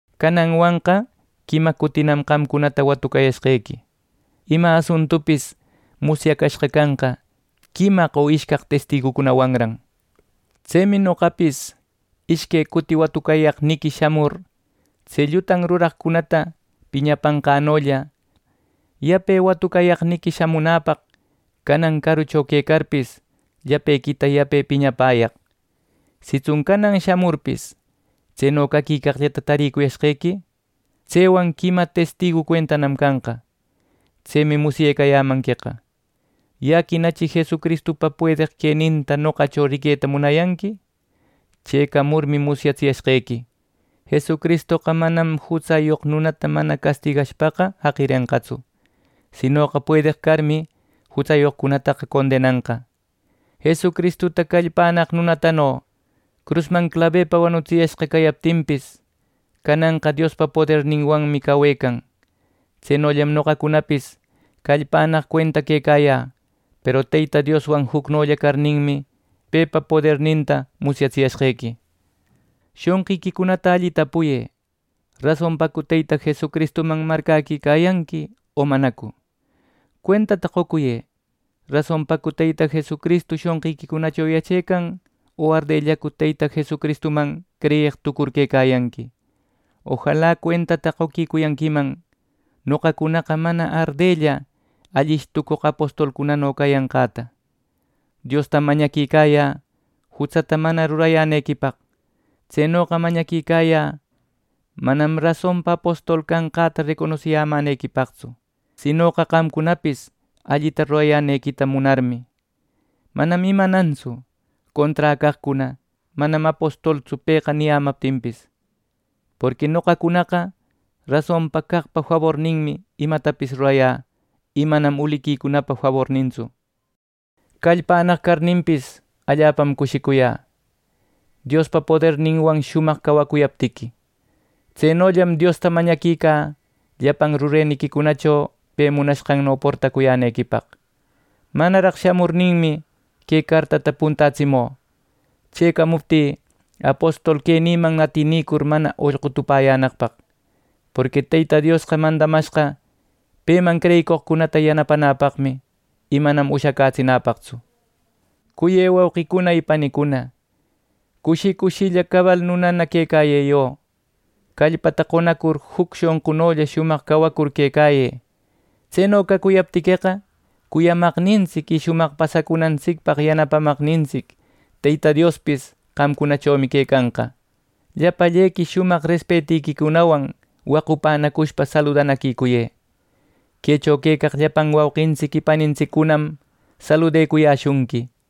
Cananwanqa quima cutinam qamcunata watucayashqequi. “Ima asuntupis musyacashqa canqa, quimaq o ishcaq testigucunwanran.” Tsemi noqapis ishque cuti watucayaqniqui shamur tse llutan ruraqcunata piñapanqänolla, yape watucayaqniqui shamunäpaq canan carucho quecarpis, llapequita yape piñapäyaq. Sitsun canan shamurpis, tseno caquicaqllata tarïcuyashqequi, tsewan quima testigu cuentanam canqa. ¡Tsemi musyecayämanqueqa! Yaquinachi Jesucristupa puedeq queninta noqacho riqueta munayanqui. Chëcamurmi musyatsiyashqequi, Jesucristoqa manam jutsayoq nunata mana catigashpaqa jaqirenqatsu. Sinoqa puedeq carmi, jutsayoqcunata condenanqa. Jesucristuta callpannaq nunatano crusman clabepa wanutsiyashqa cayaptinpis, cananqa Diospa poderninwanmi cawecan. Tsenollam noqacunapis callpannaq cuenta quecayä, peru Teyta Dioswan jucnolla carninmi, pepa poderninta musyatsiyashqequi. Shonqiquicunata alli tapuyë ¿rasonpacu Teyta Jesucristuman marcäquicayanqui o manacu! Cuentata qocuyë ¿rasonpacu Teyta Jesucristu shonqiquicunacho yachecan o ardellacu Teyta Jesucristuman creyeq tucur quecayanqui! Ojala cuentata qoquicuyanquiman noqacunaqa mana ardella allish tucoq apostolcunano cayanqäta. Diostam mañaquicayä jutsata mana rurayänequipaq. Tsenoqa mañaquicayä manam rasonpa apostol canqäta reconosiyänequipaqtsu, sinoqa qamcunapis allita rurayänequita munarmi. Manam imanantsu conträ caqcuna “Manam apostoltsu pëqa” niyämaptinpis. Porqui noqacunaqa rasonpa caqpa faborninmi imatapis rurayä y manam uliquicunapa fabornintsu. Callpannaq carninpis, allapam cushicuyä Diospa poderninwan shumaq cawacuyaptiqui. Tsenollam Diosta mañaquicä llapan rureniquicunacho pe munanqanno portacuyänequipaq. Manaraq shamurninmi, que cartäta puntätsimü, chëcamuptï, apostol quenïman atenicur mana ollqu tupäyänaqpaq. Porqui Teyta Diosqa mandamashqa peman creyicoqcunata yanapanäpaqmi, y manam ushacätsinäpaqtsu. Cuyë wauqicuna y panicuna, cushi cushilla cabal nunana quecayë yo. Callpata qonacur juc shonqunolla shumaq cawacur quecayë. Tseno cacuyaptiqueqa cuyamaqnintsic y shumaq pasacunantsipaq yanapamaqnintsic Teyta Diospis qamcunachomi quecanqa. Llapallequi shumaq respetiquicunawan wacunacushpa saludanaquicuyë. Quecho quecaq llapan wauqintsic y panintsiccunam saludecuyäshunqui.